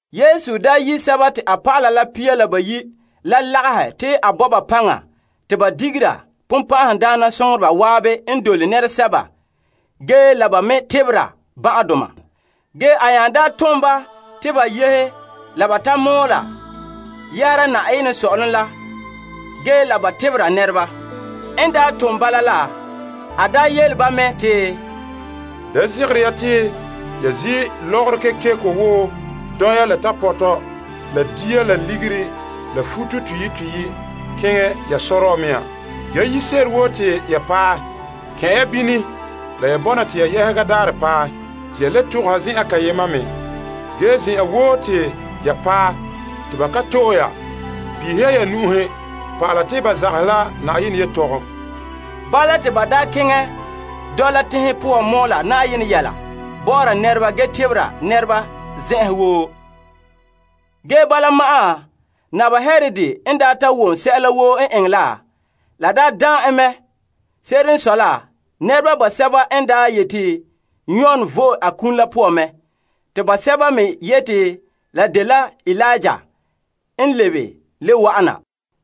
Yesu daa yi' a dɔlɔba pia la bayi' la lagahɛ te a bo ba paŋa te ba digera bonbɛ'ɛhe zan'an n dole nɛresɛba ge la ba me tebera ban'ahedoma. Ge a nya tom ba te ba yehe la ba ta mɔɔla yɛhera Na'ayenɛ Sɔ'ɔlom la ge la ba tebera nɛreba. N tone ba bala la, a yele ba mɛ te, Da zegere ya te ya zi' lɔgɔrɔ kekeko wo dɔya la tapɔtɔ la dia la ligiri la futo toyi' toyi' keŋɛ ya sɔrɔɔ mea. Ge yire se'ere woo te ya paɛ, kɛn' ya bini la ya bɔna te ya yɛhega daarɛ ta paɛ te ya le togoha zen'en kayema me. Ge zen'an woo te ya paɛ te ba ka to'e ya peehe ya ya na'ma pa'ala te ba zagahɛ la Na'ayenɛ yelehom. Bala te ba keŋɛ dɔla teŋhe poan mɔɔla Na'ayenɛ yɛla bɔ'ɔra nɛreba ge tebera nɛreba zen'an woo. Ge bala ma'an, Naba Herod n daa ta wom sɛla woo n eŋɛ la, la daan en. Se'ere n sɔe la, nɛreba basɛba n daa yete Yon vo'e a kum la poan mɛ. Te basɛba me yete la dela Eliya n lebe le wa'ana.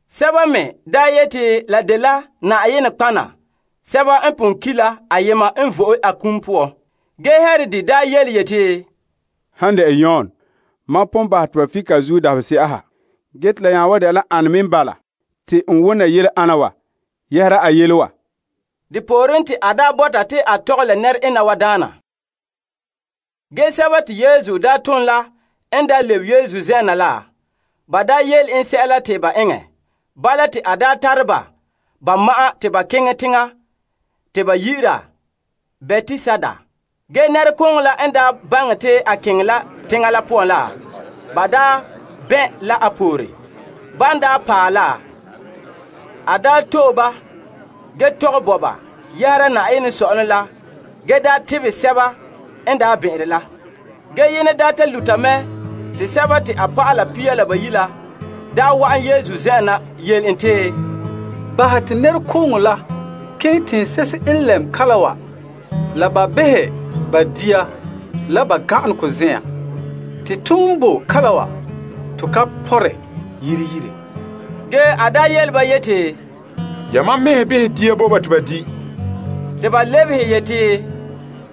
Sɛba me daa yete la dela nɔtɔgɔheba sɛba n pon ki' la ayema n vo'e a kum poan. Ge Herod daa yeti, Han dɛna Yon mam pon bahɛ te ba fike a zuo dabahese'a ha. Ge te la nya wan dɛna la ane me n bala te n wona yele ana wa yɛhera a yele wa? Depooren te a bɔta ta tɔgɛ la nɛre'ena wa daana. Ge sɛba te Yesu daa tom la n lebe Yesu zen'en na la, ba yele en sɛla te ba eŋɛ. Bala te a tare ba ba ma'an te ba keŋɛ teŋa te ba yi'ira Betsaida. Ge nɛrekooŋɔ la n baŋɛ te a keŋɛ la teŋa la poan la, ba bɛn' la a pore. Ban paɛ la, a to'e ba ge tɔgɛ bo ba yɛhera Na'ayenɛ sɔ'ɔlom la ge tebɛ sɛba n bɛn'ɛnre la. Ge yenɛ ta luta mɛ te a dɔlɔba pia la bayi' la daa wa'an Yesu zen'en na yele en yeti, Bahɛ te nɛrekooŋɔ la keŋɛ teŋse'ehe n lɛm kalam wa la ba behɛ ba dia la ba gan'aregɔ zen'en. Te ton boe kalam wa, to ka pɔnre yire yire. Ge a yele ba yeti, Yamam mɛhe behɛ dia bo ba te ba di'. Te ba lebehe yeti,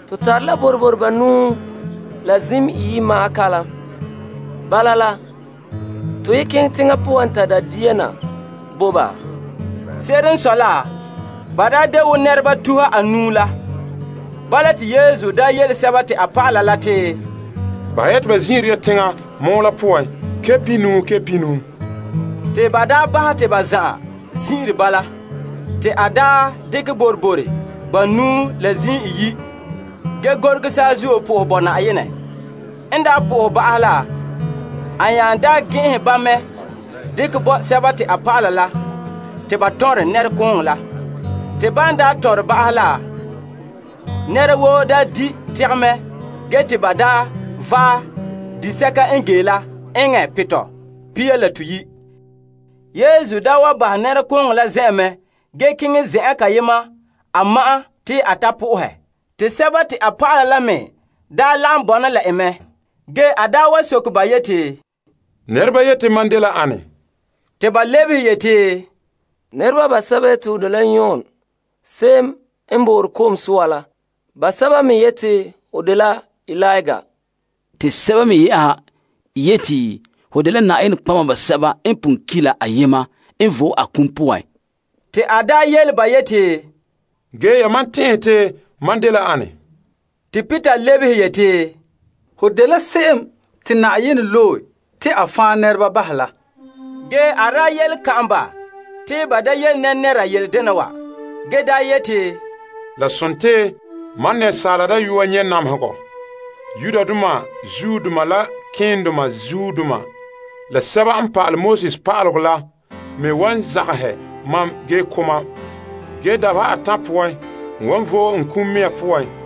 To tare la boroboro banuu la zim iyi' ma'an kalam. Bala la, to ye keŋɛ teŋa poan ta da' dia na bo ba? Se'ere n sɔe la, ba de wo nɛreba tuha anuu la. Bala te Yesu yele a dɔlɔba la te, Bahɛ ya te ba zin'ire ya teŋa mɔɔ la poan pihinuu pihinuu. Te ba bahɛ te ba zan'an zin'ire bala. Te a dekɛ boroboro banuu la la zim iyi' la ge gorege saazuo bo Yenɛ fara. N bo fara la ba'ahɛ la, a nya daa gɛn'ɛnhɛ ba mɛ dekɛ bo a dɔlɔba la te ba tɔnrɛ nɛrekooŋɔ la. Te ban tɔnrɛ ba la, nɛra woo daa di' tegɛ mɛ ge te ba vaɛ disɛka n ge la eŋɛ pitɔ pia la toyi'. Yesu daa wa bahɛ nɛrekooŋɔ la zen'en mɛ ge keŋɛ zen'an kayema a ma'an te a sohɛ Yenɛ. Te a dɔlɔba la me lagom bɔna la en mɛ. Ge a wa soke ba yeti, Nɛreba yete mam dela ane? Te ba lebehe yeti, Nɛreba basɛba yete ho dela Yon Ko'sɔɔra la. Basɛba me yete ho dela Eliya, te sɛba me yɛ'ɛha yete ho dela nɔtɔgɔheba sɛba n pon ki' la ayema n vo'e a kum poan. Te a yele ba yeti, Ge yamam tɛn'ɛhɛ te mam dela ane? Te Peter lebehe yeti, Ho dela Krista, Se'em te Yenɛ Loe La. Ge a yele kan'an ba te ba da yele nɛra yele dena wa. A yeti, La dela Asaala Dayɔa nyɛ' namehegɔ. Yudoma kpɛ'ɛndoma, malema keendoma, la pa'alegɔ pa'aleba la me wan zagahɛ mam ge ko' mam. Ge dabeha atan' poan, n wan vo'e n kum mea poan.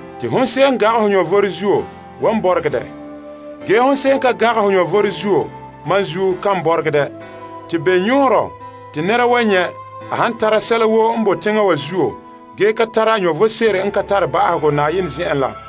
Te hon se'em n gangɛ ho vom zuo wan bɔregɛ dɛ. Ge hon se'em n ka gangɛ ho vom zuo mam zuo kan bɔregɛ dɛ. Te bene yɔɔrɔ te nɛra wan nyɛ' a han tara sɛla woo n bo teŋa wa zuo ge kan tara vom sebo n ka tare ba'ahegɔ Na'ayenɛ zen'en la?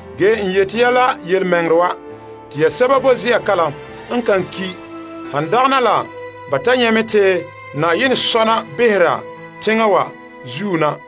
Ge n yete ya la yelemɛŋɛrɛ wa. Te ya sɛba boe ze'a kalam n kan ki' han dagana la ba ta nyɛ' mɛ te Na'ayenɛ sɔna behera teŋa wa zuo na.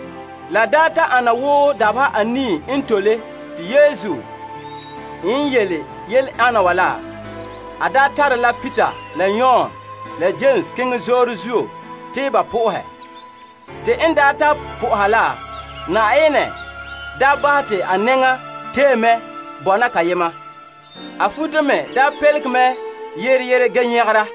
La ta ana wo dabeha anii n tole te Yesu n yele yele ana wa la, a tare la Peter la Yon la Yames keŋɛ zoore zuo te ba sohɛ Yenɛ. Te n ta soha la, Na'ayenɛ bahɛ te a nɛŋa tee mɛ bɔna kayema. A futo me pelege mɛ yere yere ge nyagera.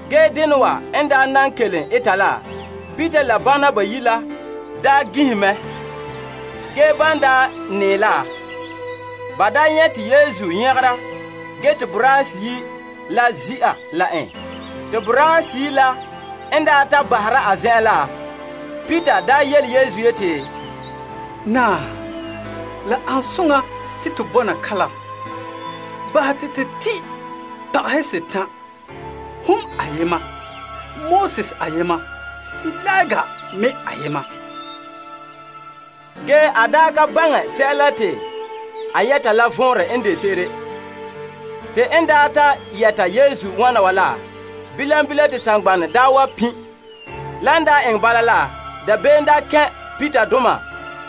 Ge dena wa n nan kelom eta la, Peter la bana bayi' la gin'ihe mɛ. Ge ban ta nɛɛ la, ba nyɛ' te Yesu nyagera ge te boraahe seyi' la ze'a la en. Te boraahe seyi' la n ta bahera a zen'en la, Peter yele Yesu yeti, Naa, la ane soŋa te to bɔna kalam. Bahɛ te to tin' pagahe setan'. Hon ayema, Moses ayema, Eliya me ayema. Ge a ka baŋɛ sɛla te a yɛta la vɔnrɛ n de se'ere. Te n ta yɛta Yesu wana wa la, bilam bilam te saŋgbana wa pin'. Lan eŋɛ bala la, dabeem kɛn' Peterdoma.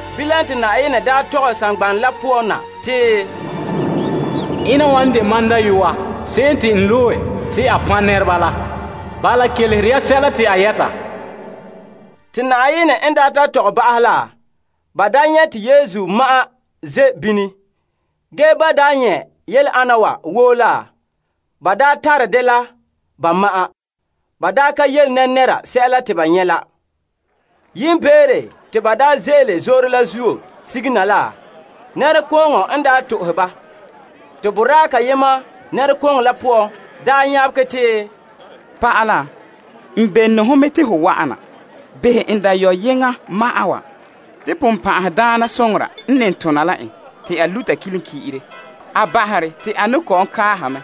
Bilam te konkore tɔgɛ saŋgbana la poan na te, Ena wa n de mam Dayɔa se'em te n loe te a fan' nɛreba la. Bala kelehera sɛla te a yɛta. Te Na'ayenɛ n ta tɔgɛ ba'ahɛ la, ba nyɛ' te Yesu ma'an ze' bini. Ge ban nyɛ' yele ana wa woo la ba tare dɛ la ba ma'an. Ba ka yele nɛnɛra sɛla te ba nyɛ' la. Yiimbeere te ba ze'ele zoore la zuo sige na la, nɛrekooŋɔ n to'ohɛ ba. Te boraa kayema nɛrekooŋɔ la poan nyabegɛ te, Pa'ala n bene ho mɛ te ho wa'ana behɛ n dayɔyeŋa ma'an wa. Te bonbe'a n ne tona la en te a luta kilenki'ire. A bahere te a ne kɔ'ɔn kaaha mɛ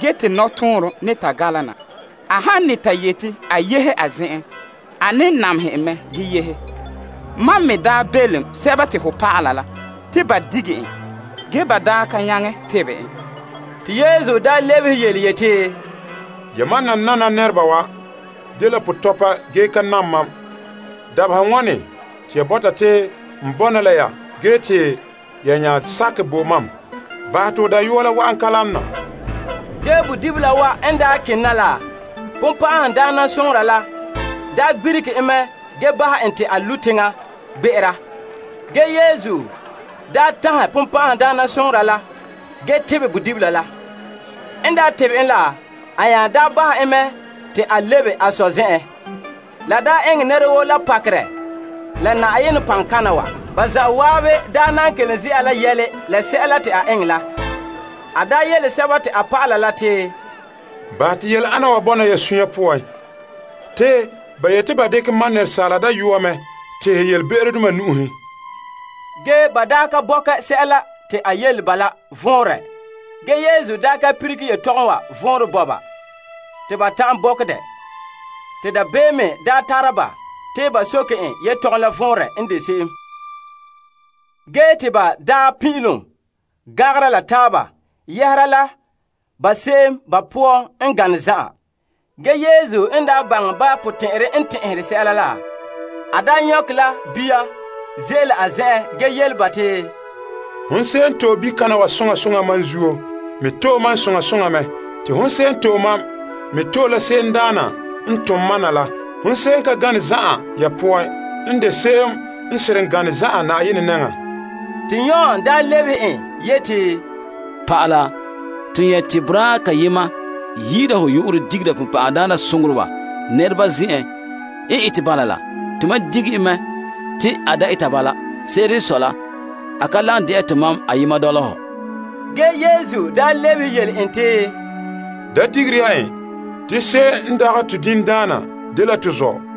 ge te nɔtɔɔnrom ne ta gala na, ge saŋa woo ka namehɛ en la bala. Mam me daa belom ho dɔlɔba la te ba dige en. Ge ba ka nyaŋɛ tebɛ en. Te Yesu lebehe yeti, Yamam nanana nɛreba wa dela pɔtɔpa ge ka nam mam! Dabeha wane te ya bɔta te n bɔna la ya ge te ya nya sakɛ bo mam? Bahɛ te ho dayɔa la wa'an kalam na. Ge bodibila wa n kene na la bonbe'a la gbirige en mɛ ge bahɛ en te a lu' teŋa gbe'era. Ge Yesu tanhɛ bonbe'a la ge tebɛ bodibila la. N tebɛ en la, a nya bahɛ en mɛ te a lebe a sɔ zen'en. La daa eŋɛ nɛra woo la pakerɛ la Na'ayenɛ paŋkana wa. Ba zan'an n nan kelom ze'a yɛla la sɛla te a eŋɛ la, a yele a dɔlɔba la te, Bahɛ te yele ana wa bɔna ya suunre poan. Te ba yete ba dekɛ Asaala Dayɔa mɛ tehɛ yelebe'erodoma nu'uhen. Ge ba ka bɔkɛ sɛla te a yele ba la vɔnrɛ ge Yesu ka lilige yelehom wa vɔnrɛ bo ba te ba ta'an bɔkɛ dɛ. Te dabeem me tare ba te ba soke en yelehom la vɔnrɛ n de se'em. Ge te ba pin'ilom gangera la taaba yɛhera la ba se'em ba poan n gane zan'an. Ge Yesu n baŋɛ ba potɛn'ɛra n tɛn'ɛre sɛla la, a nyɔkɛ la bia ze'ele a zen'en ge yele ba te, Hon se'em n to'e bikana wa soŋa soŋa mam zuo, me to'e mam soŋa soŋa mɛ. Te hon se'em n to'e mam me to'e la se'emdaana n tom mam na la. Hon se'em n pɔ'ɛ ya zan'an poan n de se'em n seren gane zan'an Na'ayenɛ nɛŋan. Te Yon lebehe en yeti, Pa'ala, to nyɛ' te boraa kayema yi'ira ho yu'urɛ digera bonbɛ'ɛhe nɛreba zen'en. N ete bala la, to mam dige en mɛ te a da eta bala. Se'ere n sɔe la, a ka lagom dɛna tomam ayema dɔla hɔ. Ge Yesu lebehe yele en te, Da digere ya en. Te se'em n dagɛ to diŋdaana dela to zɔ'.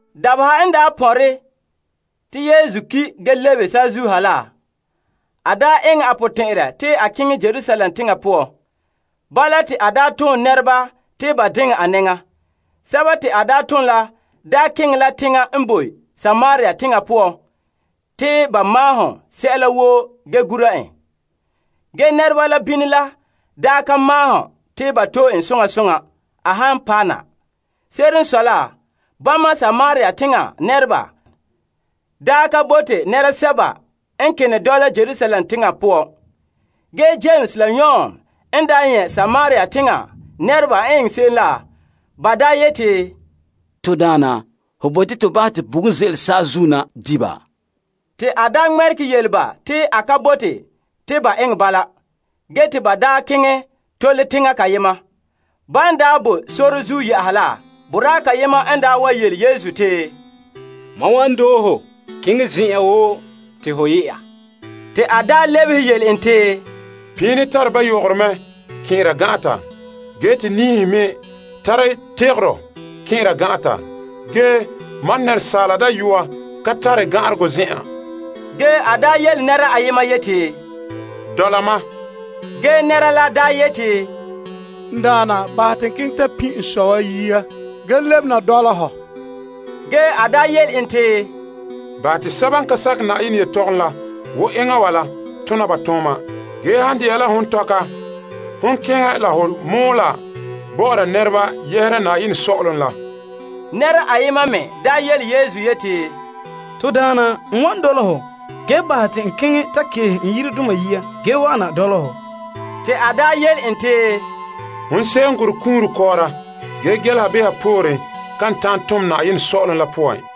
Dabeha n pɔnre te Yesu ki' ge lebe saazuo ha la, a eŋɛ a potɛn'ɛrɛ te a keŋɛ Yerusalem teŋa poan. Bala te a tom nɛreba te ba diŋɛ a nɛŋa. Sɛba te a tom la keŋɛ la teŋa n boe Samaria teŋa poan te ba maahom sɛla woo ge gura en. Ge nɛreba la bini la ka maahom te ba to'e en soŋa soŋa a han paɛ na. Se'ere n sɔe la, bama Samaria teŋa nɛreba ka bote nɛresɛba n kene dɔla Yerusalem teŋa poan. Ge Yames la Yon n nyɛ' Samaria teŋa nɛreba n eŋɛ se'em la, ba yeti, To Daana, ho bote to bahɛ te bugum ze'ele saazuo na di' ba? Te a ŋmɛregɛ yele ba te a ka bote te ba eŋɛ bala. Ge te ba keŋɛ tole teŋa kayema. Ban bo sore zuo yɛ'a la, boraa kayema n wa yele Yesu te, Mam wan doohe ho keŋɛ zen'en woo te ho yɛ'a. Te a lebehe yele en te, Piini tare ba yogoro mɛ kɛn'ɛra gan'ata, ge te niihe me tara tekoro kɛn'ɛra gan'ata. Ge Asaala Dayɔa ka tare gan'aregɔ zen'an. Ge a yele nɛra ayema yeti, Dɔla ma. Ge nɛra la yeti, N Daana, bahɛ te n keŋɛ ta pin' n sɔ wa yia ge lebe na dɔla hɔ. Ge a yele en te, Bahɛ te kum la laɛ kum la, sakɛ Na'ayenɛ yelehom la wo enŋa wa la tona ba tooma. Ge han de'a la hon tɔka, hon keŋɛ la ho mɔɔla bɔ'ɔra nɛreba yɛhera Na'ayenɛ Sɔ'ɔlom la. Nɛra ayema me yele Yesu yeti, To Daana, n wa dɔla ho, ge bahɛ te n keŋɛ ta keehe n yiredoma yia ge wa'ana dɔla hɔ. Te a yele en te, Hon se'em n gorɛ kunre kɔɔra ge gɛleha behera poore kan ta'an tom Na'ayenɛ Sɔ'ɔlom la poan.